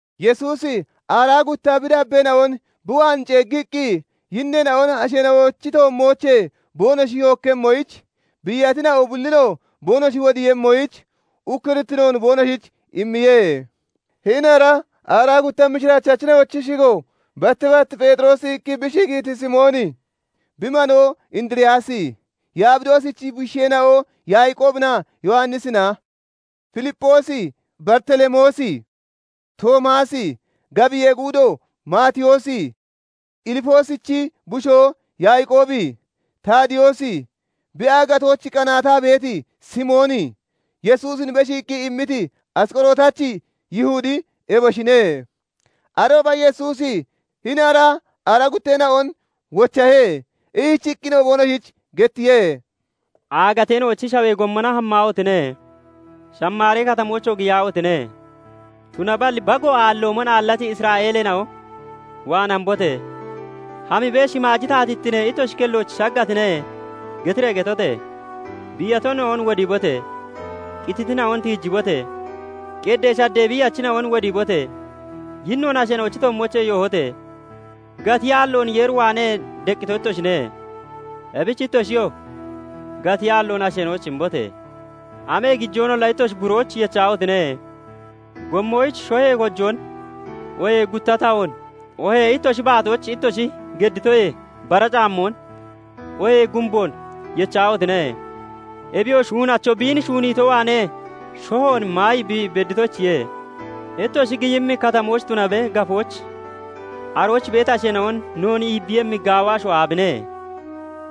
Yesuusi aaraa gutta bi dabbeena'on bi waan ceeggiqqi, yinneena'on asheena'ochi toommoochee boonoshi yookkemmoyich, biiyatina'o bullinoo boonoshi wodiiyemmoyich ukkurittinoon boonoshich immiye. Hini ara aaraa gutta mishiraachachina'ochi shigo, batti bat "Pheexiroosi" iqqi bi shigiiti Simooni, bi manoo Indiriyaasi, Yabidoosichi bushiisheena'o Yaaqoobinaa Yowannisina, Filipphoosi, Baritelemoosi, Toomaasi, gabiyee guudo Maatiyoosi, Ilfoosichi bushoo Yaaqoobi, Taadiyoosi, Bi aagatoyich qanaataa beeti Simooni, Yesuusin beshiiqqi immiti Asqorotachi Yihudi eboshine. Arooba Yesuusi hini ara aaraa gutteena'on wochahe; ishichiqqinoo boonoshich gettiye:- "Aagateena'ochi shawee gommona hammaahotine! Shamaari Katamoochoo giyaahotine! Tunaballi bago aalloomon aallati Isra'eeleena'o waan hambote! Hamibee, 'Shimaaji taatittine ittoshi kellooch shaggatine' getiree getote! Biiyatina'on wodiibote! Qititina'on tiijibote! Qeddee shaddee biiyachina'on wodiibote! Yinnoon asheena'ochi toommoochee yoohote! Gatiyaalloon Yeer waanee deqqito ittoshine; ebich ittoshiyoo gatiyaalloon asheena'oyich imbote! Amee gijoonolla ittoshi burooch yechahotine! Gommoyich shohee kojoon, oohee gutta tahoon, oohee ittoshi baatooch ittoshi gedditoyee bara caammoon, oohee gumboon yechahotine! Ebiyoo shuunacho biin shuuniito waanee shohoon maayi bi bedditoyichiye. "Ittoshi giyimmi katamooch tunabe, gafooch arooch beeti asheena'on 'Noon iibbiiyemmi gaawa asho aabine?'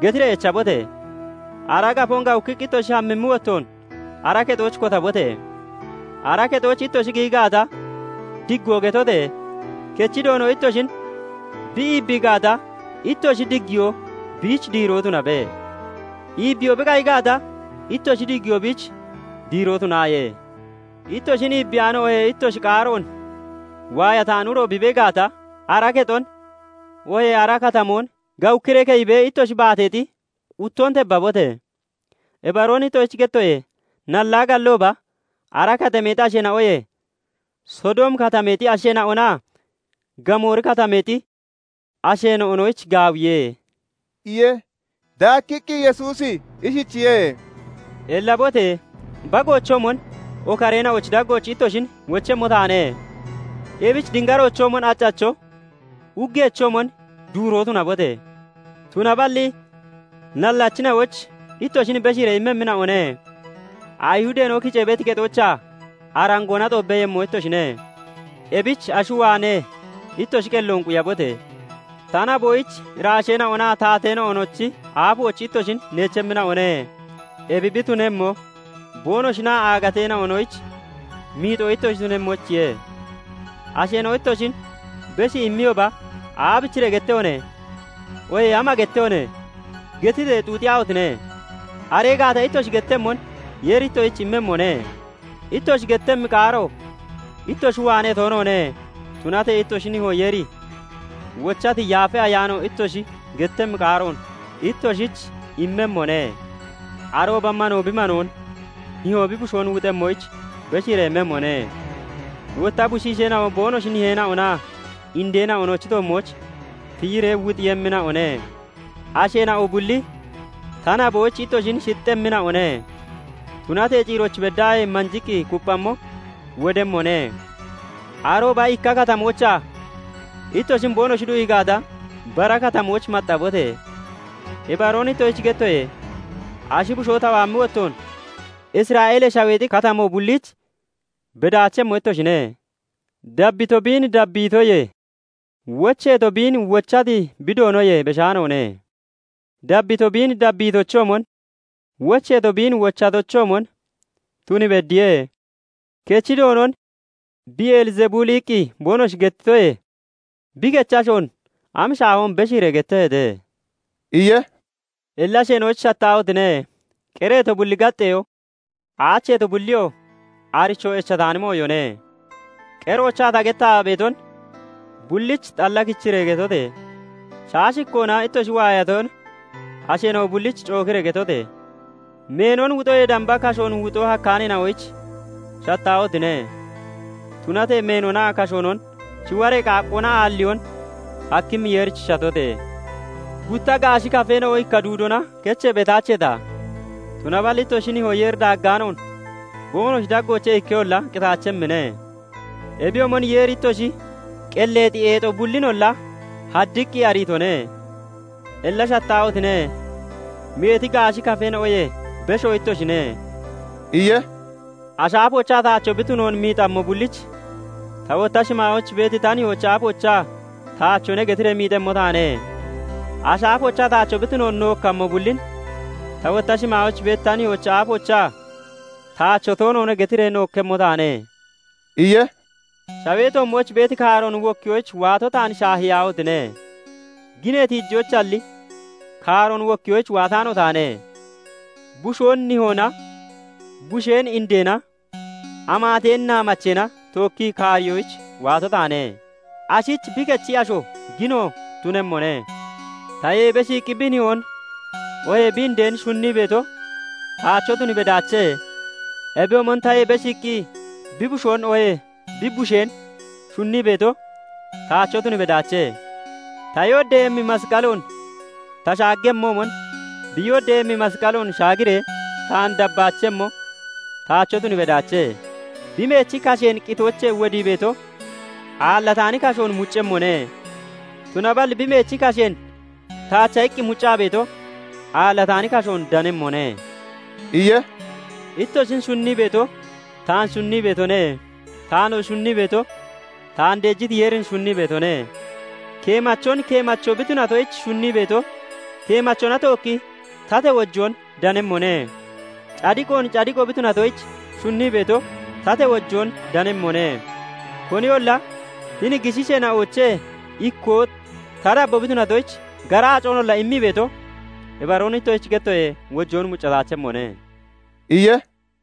getiree echabote! Ara gafoon gawukkiqqi ittoshi hammimmi wottoon ara kexooch kotabote! Ara kexooch ittoshi giyi gaata, diggoo getote! Kechi Doono ittoshin bi iibbii gaata, ittoshi diggiyoo biich diiroo tunabe; iibbiyoo bi qayi gaata, ittoshi diggiyoo biich diiroo tunaaye. Ittoshin iibbiyaano oohee ittoshi qaaroon waayataani uro bi dana gaata, ara kexon oohee ara katamoon gawukkiree keyibee ittoshi baateexi quttoon tebbabote! Ibaroon ittoshich gettoye; nallaa gallooba ara katameexi asheena'oyee Sodoomi Katameexi asheena'onaa Gamoori Katameexi asheena'onoyich gaawiye" iye. Daakkiqqi Yesuusi ishichiye:- "Ellabote! Bagoochoomon okareena'ochi daggooch ittoshin wochemmo taane. Ebich dingaroochoomon accacho, uggeechoomon duuroo tunabote! Tunaballi nallachina'oyich ittoshin beshiiree immemmina'one; Ayihudeena'o kicee beeti kexoochaa arangoona xoobbeeyemmo ittoshine; ebich ashi waanee ittoshi qelloon quyabote! Ta naboyich iraasheena'onaa taateena'onochi aafooch ittoshin neechemmina'one; ebi bi tunemmo boonoshinaa aagateena'onoyich miixoo ittoshi tunemmoyichiye. Asheena'o ittoshin beshii imiyooba 'Aabichiree gettehone?' oohee 'Ama gettehone?' getiree xuuxiyaahotine! Aree gaata ittoshi gettemmon Yeeri ittoshich immemmone. Ittoshi gettemmi qaaro ittoshi waanee toonoone; tunatee ittoshi nihoo Yeeri wochati Yaafa Ayaano ittoshi gettemmi qaaroon ittoshich immemmone. "Arooba manoo bi manoon, nihoo bi bushoon wuxemmoyich beshiiree immemmone; wotta bushiisheena'o boonoshi niheena'onaa indeena'onochi toommooch tiyiree wuxiiyemmina'one. Asheena'o bulli ta naboyich ittoshin shixxemmina'one; tunatee ciirooch beddaahee manjiqqi kupphammo wodemmone. Arooba ikka katamoochaa ittoshin boonoshi du'ii gaata, bara katamooch maxxabote! Ibaroon ittoshich gettoye; ashi bushoo ta waammi wottoon Isra'eelee Shaweexi katamoo bulliich bedaachemmo ittoshine. "Dabbito biin dabbiitoyee, wocheeto biin wochati bi doonoyee beshaanoone. Dabbito biin dabbiitochoomon, wocheeto biin wochatochoomon tun beddiye. Kechi doonon 'Beelzebuli' iqqi boonoshi gettitoyee, bi kechi ashoon am shaahoon beshiiree getteeheete!" iye. "Illa asheena'oyich shattaahotine! Qereeto bulli gaxxeyoo, aacheeto bulliyoo aricho echataani mooyone. Qeroochaa ta gettaa beeton bullich xalla kichiree getote! Shaashikkoona ittoshi waayaton asheena'o bullich cookiree getote! Meenon wuxoyee damba kashoon wuxoo hakkaaneena'oyich shattaahotine! Tunatee meenonaa kashoonon shiwaree qaaqqoona aalliyoon hakkimmi Yeerich shatote! Gutta gaashi kafeena'o ikka duudina kechee beetaacheeta? Tunaballi ittoshi nihoo Yeeri daaggaanoon boonoshi daggoochee ikkeyolla qitaachemmine. Ebiyoomon Yeeri ittoshi qelleexi eexo bullinolla haddiqqi ariitone. Illa shattaahotine! Meeti gaashi kafeena'oyee beshoo ittoshine" iye. "Ashi aafoochaa taacho bi tunoon miixammo bullich ta wotta shimaayooch beeti ta nihoochi aafoochaa 'Taachone' getiree miixemmo taane; Ashi aafoochaa taacho bi tunoon nookkammo bullin ta wotta shimaayooch beeti ta nihoochi aafoochaa 'Taacho toonoone' getiree nookkemmo taane" iye. "Shawee toommooch beeti kaaroon wokkiyoyich waato taan shaahiyaahotine! Ginee tiijoyichalli kaaroon wokkiyoyich waataano taane. Bushoon nihoona, busheen indeena, amaateen naamacheena tookki kaariyoyich waato taane. Ashich bi kechi asho gino tunemmone. "Tayee beshiiqqi bi nihoon oohee bi indeen shunnii beeto taacho tun bedaache; ebiyoomon tayee beshiiqqi bi bushoon oohee bi busheen shunnii beeto taacho tun bedaache; ta yooddeeyemmi masqaloon ta shaaggemmoomon, bi yooddeeyemmi masqaloon shaagiree taan dabbaachemmo taacho tun bedaache. Bi meechi kasheen qitoochee wodii beeto, aallataani kashoon muccemmone; tunaballi bi meechi kasheen taacha iqqi muccaa beeto, aallataani kashoon danemmone" iye. "Ittoshin shunnii beeto taan shunnii beetone; taanoo shunnii beeto taan deejiti Yeerin shunnii beetone. Keemachon, keemacho bi tunatoyich shunnii beeto, keemachona tookki tatee wojoon danemmone; cadiqoon, cadiqo bi tunatoyich shunnii beeto, tatee wojoon danemmone. Koniyolla hini gishiisheena'oochee ikkoo ta dabboo bi tunatoyich gara aaconolla immii beeto, ibaroon ittoshich gettoye, wojoon muccataachemmone" iye.